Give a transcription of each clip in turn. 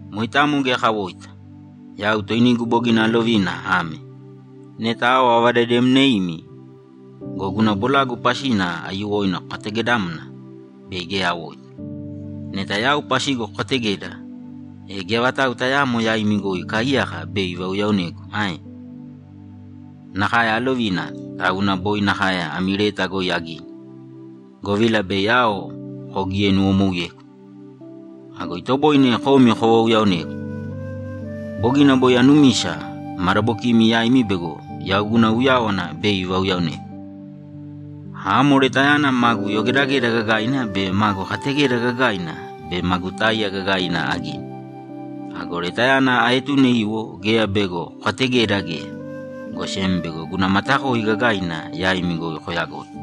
Moitamo geya kawoita. Yau toinigu bogina alovina ame: Neta ao avadademneimi go, guna bolagu pasina aiyuwoina kokategedamna, bei geya awoita. Neta yau pasigu kokategeda, e geya vatau tayaamo yaimi goi ikaaiyaka bei ivauyaonegu ae? Nakae alovina, tauna boi nakae ami leta goi agini, govila bei ao kogienuwomouyegu. Ago itoboine komi kovauyaonegu! Bogina boi anumisa madabokimi yaimi bego yau guna uyáwana bei ivauyaonemi. Amo letayana magu yogedageda gagaina be magu kategeda gagaina be magu táiya gagaina agini. Ago letayana aetune iwo geya bego kokategeda geya, go sem bego guna matakoi gagaina yaimi goi koyagoi.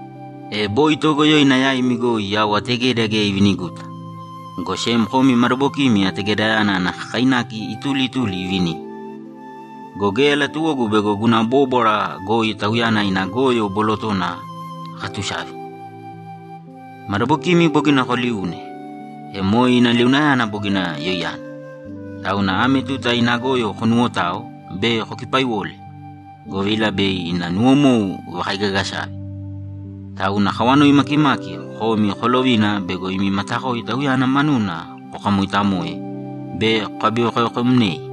E boi toogoyoina yaimi goi yau ategeda geya iviniguta, go sem komi madabokimi ategedayana ana kakainaki ituli ituli ivinimi. Go geya latuwogu bego guna bóbwara goi tauyana ina goyo bolotona akatusavi. Madabokimi bogina koliune, e moe ina liunayana bogina yoiyana. Tauna ame tuta ina goyo konuwotāo be kokipaiwōle, govila bei ina nuwomou ivakaigagasave. Tauna akawanoi makimaki komi kolovina bego imi matakoi tauyana manuna kokamoitamoe be kokabivekovekomnei.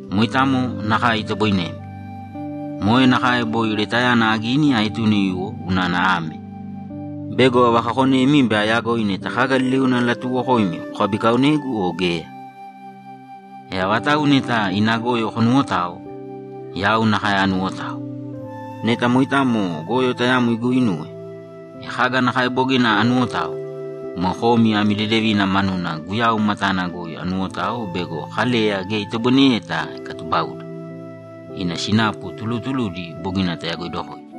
Moitamo nakae itoboinemi. Moe nakae boi letayana agini aetune iwo unana ame: Bego avakakonemi be ayagoi neta kaga liliuna alatuuwokoimi kokabikaonegu o geya. E avatau neta ina goyo konuwotao, yau nakae anuwotao. Neta moitamo goyo tayamo iguinuwe, e kaga nakae bogina anuwotao, moe komi ami dedevina manuna Guyau matana goi anuwotao bego Kaleya geya itoboineyeta ikatubauda. Ina sinapu tulutuludi bogina tayagoidokoidi.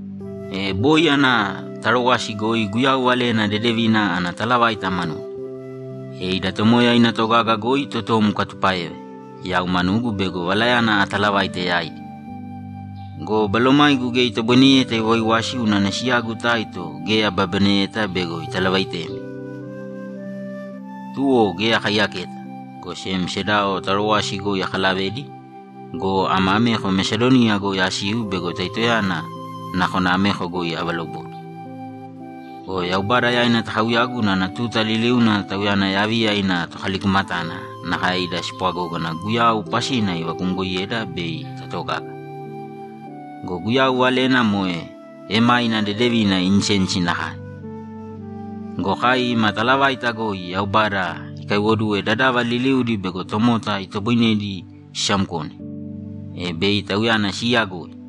E boi ana Tarowasi goi Guyau Valena Dedevina ana talavaita manuna. E ida Tomoya ina togaga goi totom ikatupáeva yau manugu bego valayana atalavaite yaidi go, balomaigu geya itoboineyeta iwaiwasi unana siyagu Taito geya ababaneyeta bego italavaitemi. Tuwo geya akaiyaketa, go sem sedao Tarowasi goi akalavedi go, ama ameko Mesadoniya goi asiu bego Taitoyana nakona ameko goi avalobode. Go Yaubada yaina takauyagu unana tuta liliuna Tauyana yaviya ina tokalikumatana nakae ida spwagógana Guyau pasina ivakumgoiyeda bei tatogaga. Go Guyau valena moe emáina dedevina insensi nakae go, kai ima talavaita goi Yaubada ikaiwoduwe dadava liliudi bego tomota itoboinedi sisamkone, e bei Tauyana siiyagoi.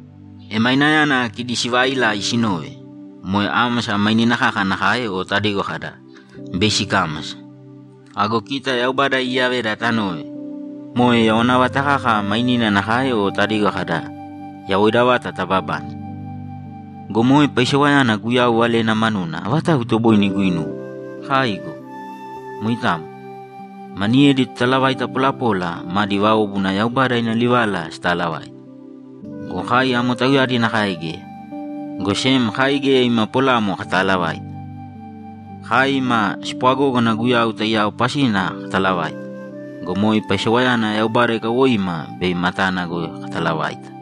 Emainayana kidi siivailai sinove, moe ámasa mainina kaka nakae o tadigo kada, ‘Bei sikámasa.’ Ago kita Yaubada iiyaveda tanove, moe yawana vata kaka mainina nakae o tadigo kada, ‘Yawoida vata tababane.’ Go moe paisewayana Guyau Valena manuna avatau itoboine iguinuwe? Kaai go! Moitamo. Maniyedi totalavaita polapola madi váobuna Yaubada ina livala sitaalavaite. Go kai amo tauyadi nakae geya, go sem kai geya ima polamo kataalavaita. Kai ima spwagógana Guyau taiyao pasina katalavaita go, moe paisewayana Yaubada ikawoima bei matana goi katalavaita.